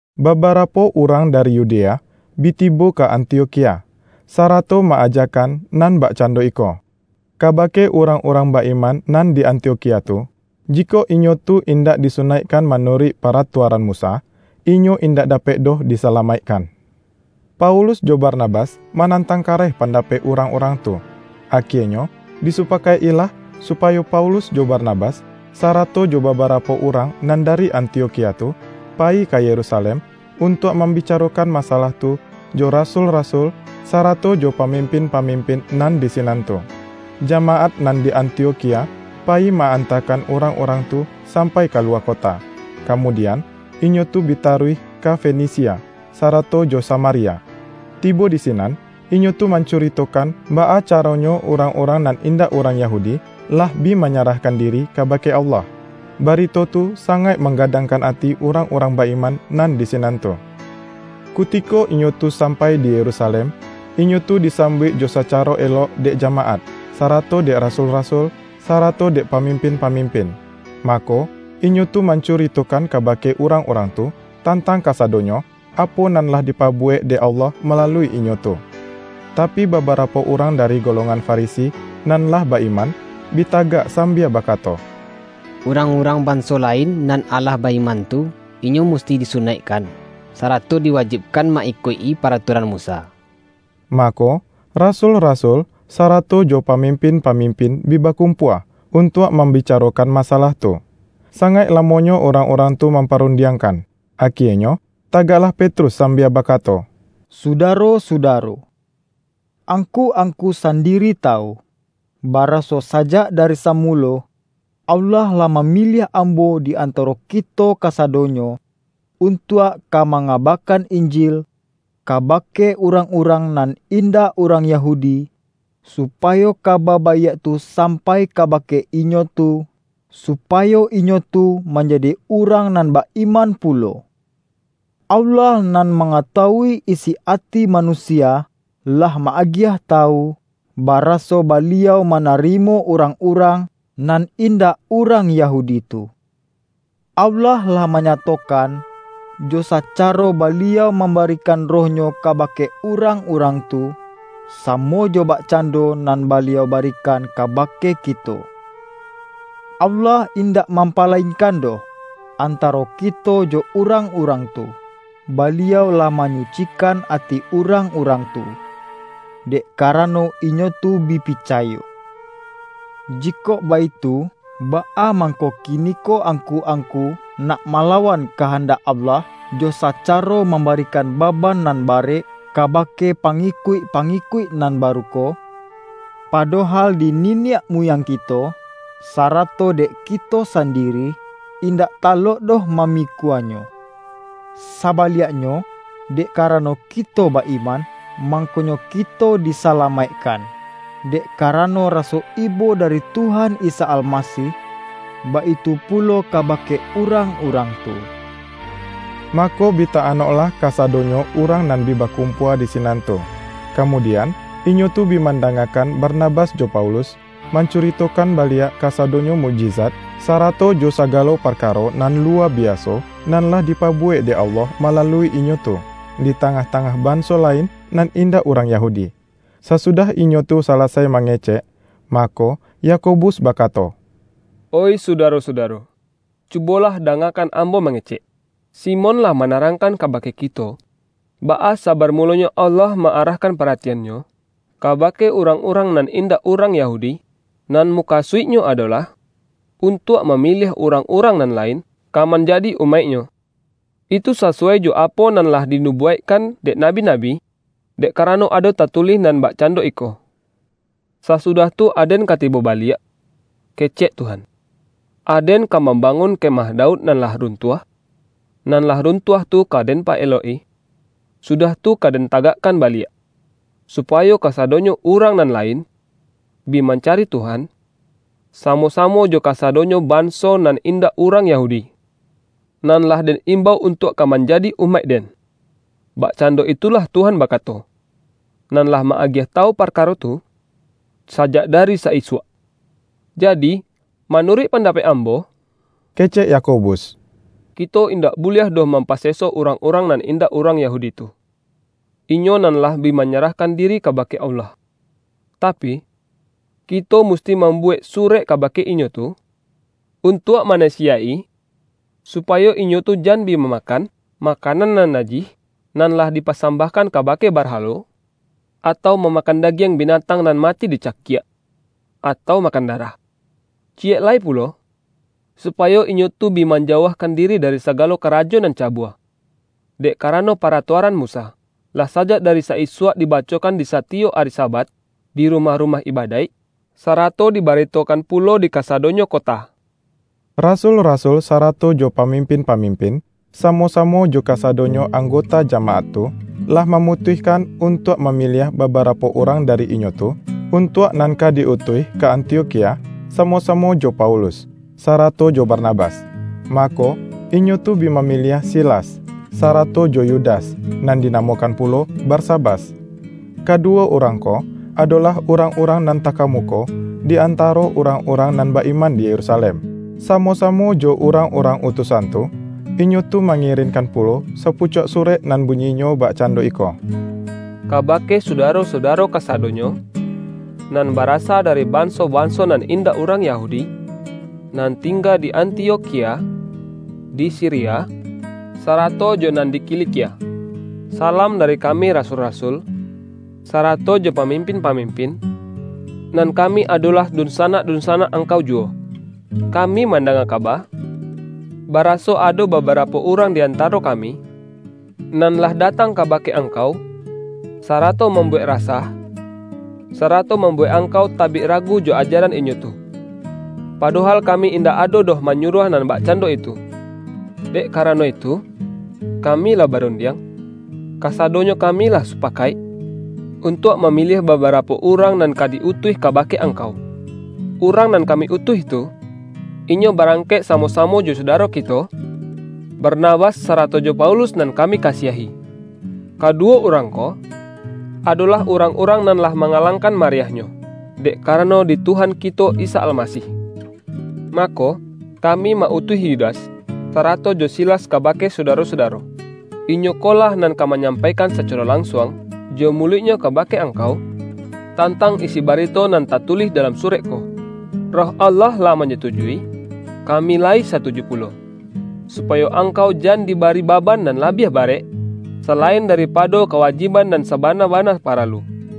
Babarapo urang dari Yudea bi tibo ka Antiokhia, sarato ma-ajakan nan bakcando iko, kabake urang-urang ba-iman nan di Antiokhia tu, jikok inyo tu indak disunaikkan manuruik paratuaran Musa, inyo indak dapek doh disalamaikkan. Paulus jo Barnabas manantang kareh pandapek urang-urang tu. Akienyo disupakaik-ilah, supayo Paulus jo Barnabas, sarato jo babarapo urang nan dari Antiokhia tu, payi ka Yerusalem untuak mambicarokan masalah tu jo rasul-rasul sarato jo pamimpin-pamimpin nan di sinan tu. Jamaat nan di Antiokhia payi ma-antakan urang-urang tu sampai kaluwa kota, kamudian, inyo tu bi taruih ka Fenisia, sarato jo Samaria. Tibo di sinan, inyo tu mancuritokan, baa caronyo urang-urang nan indak urang Yahudi, lah bi manyarahkan diri kabake Allah. Barito tu sangaik manggadangkan ati urang-urang ba-iman nan di sinan tu. Kutiko inyo tu sampai di Yerusalem, inyo tu disambuik jo sacaro elok dek jamaat, sarato dek rasul-rasul, sarato dek pamimpin-pamimpin. Mako, inyo tu mancuritokan kabake urang-urang tu, tantang kasadonyo, apo nan lah dipabuwek dek Allah malalui inyo tu. Tapi, babarapo urang dari golongan Farisi, nan lah ba-iman, bi tagak sambia bakato,”Urang-urang banso lain nan lah ba-iman tu, inyo musti disunaikkan, sarato diwajibkan ma-ikuik-i paratuaran Musa.” Mako, rasul-rasul, sarato jo pamimpin-pamimpin bi bakumpua, untuak mambicarokan masalah tu. Sangaik lamonyo urang-urang tu mamparundiangkan. Akienyo tagaklah Petrus sambia bakato,”Sudaro-sudaro! Angku-angku sandiri tawu, baraso sajak dari samulo, Allah lah mamiliah ambo di antaro kito kasadonyo, untuak ka mangabakan Injil kabake urang-urang nan indak urang Yahudi, supayo Kaba Baiak tu sampai kabake inyo tu, supayo inyo tu manjadi urang nan ba-iman pulo. Allah nan mangatawui isi ati manusia, lah ma-agiah tawu, baraso Baliau manarimo urang-urang nan indak urang Yahudi tu. Allah lah manyatokan, jo sacaro Baliau mambarikan Roh-Nyo kabake urang-urang tu, samo jo bakcando nan Baliau barikan kabake kito. Allah indak mampalainkan doh, antaro kito jo urang-urang tu. Baliau lah manyucikan ati urang-urang tu, dek karano inyo tu bi picayo. Jikok baitu, baa mangko kiniko angku-angku nak malawan kahandak Allah, jo sacaro mambarikan baban nan barek kabake pangikuik-pangikuik nan baru ko, padohal di niniak muyang kito, sarato dek kito sandiri, indak talok doh mamikuanyo? Sabaliaknyo, dek karano kito ba-iman, mangkonyo kito disalamaikkan, dek karano raso ibo dari Tuhan Isa Almasih; baitu pulo kabake urang-urang tu.” Mako bi ta-anoklah kasadonyo urang nan bi bakumpua di sinan tu. Kamudian, inyo tu bi mandangakan Barnabas jo Paulus, mancuritokan baliak kasadonyo mukjizat, sarato jo sagalo parkaro nan luwa biaso, nan lah dipabuwek dek Allah malalui inyo tu, di tangah-tangah banso lain nan indak urang Yahudi. Sasudah inyo tu salasai mangecek, mako, Yakobus bakato,”Oih Sudaro-sudaro! Cubolah dangakan ambo mangecek. Simon lah manarangkan kabake kito, baa sabarmulonyo Allah ma-arahkan paratian-Nyo kabake urang-urang nan indak urang Yahudi, nan mukasuik-Nyo adolah untuak mamiliah urang-urang nan lain, ka manjadi umaik-Nyo. Itu sasuwai jo apo nan lah dinubuwaikkan dek nabi-nabi. Dek karano ado tatulih nan bakcando iko, ’Sasudah tu Aden ka tibo baliak,' kecek Tuhan, ’Aden ka mambangun kemah Daud nan lah runtuah, nan lah runtuah tu ka Den paelok-i, sudah tu ka Den tagakkan baliak; supayo kasadonyo urang nan lain, bi mancari Tuhan, samo-samo jo kasadonyo banso nan indak urang Yahudi, nan lah Den imbau untuak ka manjadi umaik-Den.’ Bakcando itulah Tuhan bakato, nan lah ma-agiah tawu parkaro tu, sajak dari sa-isuak.” ”Jadi, manuruik pandapek ambo,” kecek Yakobus,”kito indak buliah doh mampaseso urang-urang nan indak urang Yahudi tu, inyo nan lah bi manyarahkan diri kabake Allah. Tapi, kito musti mambuwek surek kabake inyo tu, untuak manasiyaik-i, supayo inyo tu jan bi mamakan, makanan nan najih, nan lah dipasambahkan kabake barhalo, atau mamakan dagiang binatang nan mati dicakiak, atau makan darah. Ciyek lai pulo, supayo inyo tu bi manjauahkan diri dari sagalo karajo nan cabua. Dek karano paratuaran Musa, lah sajak dari sa-isuak dibacokan disatiyok ari Sabat, di rumah-rumah ibadaik, sarato dibaritokan pulo dikasadonyo kota.” Rasul-rasul sarato jo pamimpin-pamimpin, samo-samo jo kasadonyo anggota jamaat tu, lah mamutuihkan untuak mamiliah babarapo urang dari inyo tu, untuak nan ka di-utuih ka Antiokhia, samo-samo jo Paulus, sarato jo Barnabas. Mako, inyo tu bi mamiliah Silas, sarato jo Yudas, nan dinamokan pulo Barsabas. Kaduwo urang ko, adolah urang-urang nan takamuko di antaro urang-urang nan ba-iman di Yerusalem. Samo-samo jo urang-urang utusan tu, inyo tu mangirinkan pulo sapucuak surek nan bunyinyo bakcando iko,”Kabake sudaro-sudaro kasadonyo, nan barasa dari banso-banso nan indak urang Yahudi, nan tingga di Antiokhia, di Siria, sarato jo nan di Kilikia. Salam dari kami rasul-rasul, sarato jo pamimpin-pamimpin, nan kami adolah dunsanak-dunsanak angkau juwo. Kami mandanga kaba, baraso ado babarapo urang di antaro kami, nan lah datang kabake angkau, sarato mambuwek rasah, sarato mambuwek angkau tabik ragu jo ajaran inyo tu. Padohal kami indak ado doh manyuruah nan bakcando itu. Dek karano itu, kami lah barundiang, kasadonyo kami lah supakaik, untuak mamiliah babarapo urang nan ka di-utuih kabake angkau. Urang nan kami utuih tu, inyo barangkek samo-samo jo sudaro kito, Barnabas sarato jo Paulus nan kami kasiahi. Kaduwo urang ko, adolah urang-urang nan lah mangalangkan mariahnyo, dek karano di Tuhan kito Isa Almasih. Mako, kami ma-utuih Yudas, sarato jo Silas kabake sudaro-sudaro. Inyo ko lah nan ka manyampaikan sacaro lansuang jo muluiknyo kabake angkau, tantang isi barito nan tatulih dalam surek ko. Roh Allah lah manyatujui — kami layi satuju pulo — supayo angkau jan dibari baban nan labiah barek, salain daripado kawajiban nan sabana-bana paralu: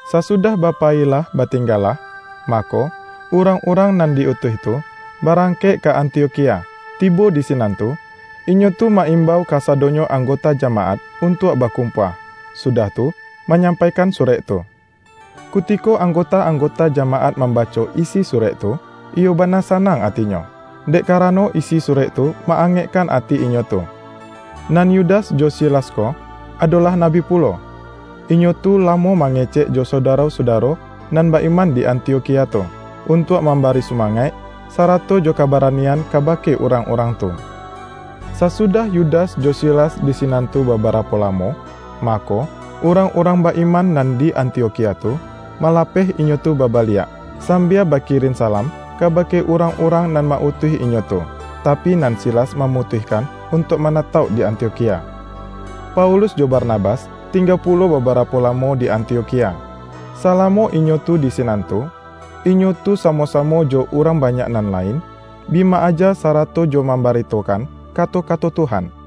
Sasudah ba payilah ba tinggalah, mako, urang-urang nan di-utuih tu, barangkek ka Antiokhia. Tibo di sinan tu, inyo tu ma-imbau kasadonyo anggota jamaat untuak bakumpua, sudah tu, manyampaikan surek tu. Kutiko anggota-anggota jamaat mambaco isi surek tu, iyo bana sanang atinyo, dek karano isi surek tu ma-angekkan ati inyo tu. Nan Yudas jo Silas ko, adolah nabi pulo, inyo tu lamo mangecek jo sudaro-sudaro nan ba-iman di Antiokhia tu, untuak mambari sumangaik, sarato jo kabaranian kabake urang-urang tu. Sasudah Yudas jo Silas di sinan tu babarapo lamo, mako, urang-urang ba-iman nan di Antiokhia tu, malapeh inyo tu babaliak, sambia bakirin salam kabake urang-urang nan ma-utuih inyo tu. [ Tapi, nan Silas mamutuihkan untuak manatauk di Antiokhia.] Paulus jo Barnabas, tingga pulo babarapo lamo di Antiokhia. Salamo inyo tu di sinan tu, inyo tu samo-samo jo urang banyak nan lain, bi ma-aja sarato jo mambaritokan kato-kato Tuhan.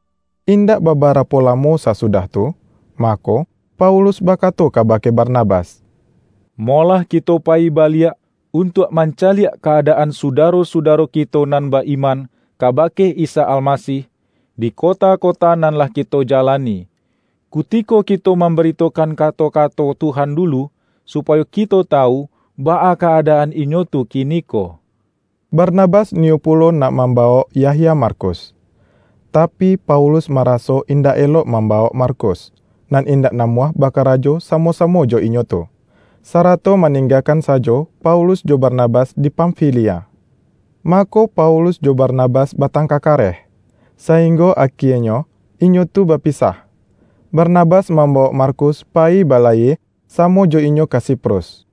Indak babarapo lamo sasudah tu, mako, Paulus bakato kabake Barnabas,”Molah kito payi baliak, untuak mancaliak ka-adaan sudaro-sudaro kito nan ba-iman kabake Isa Almasih, di kota-kota nan lah kito jalani, kutiko kito mambaritokan kato-kato Tuhan dulu; supayo kito tawu baa ka-adaan inyo tu kiniko.” Barnabas niyo pulo nak mambawok Yahya Markus, tapi, Paulus maraso indak elok mambawok Markus, nan indak namuah bakarajo samo-samo jo inyo tu, sarato maninggakan sajo Paulus jo Barnabas di Pamfilia. Mako, Paulus jo Barnabas batangka kareh, sainggo akienyo inyo tu bapisah: Barnabas mambawok Markus payi balayie samo jo inyo ka Siprus.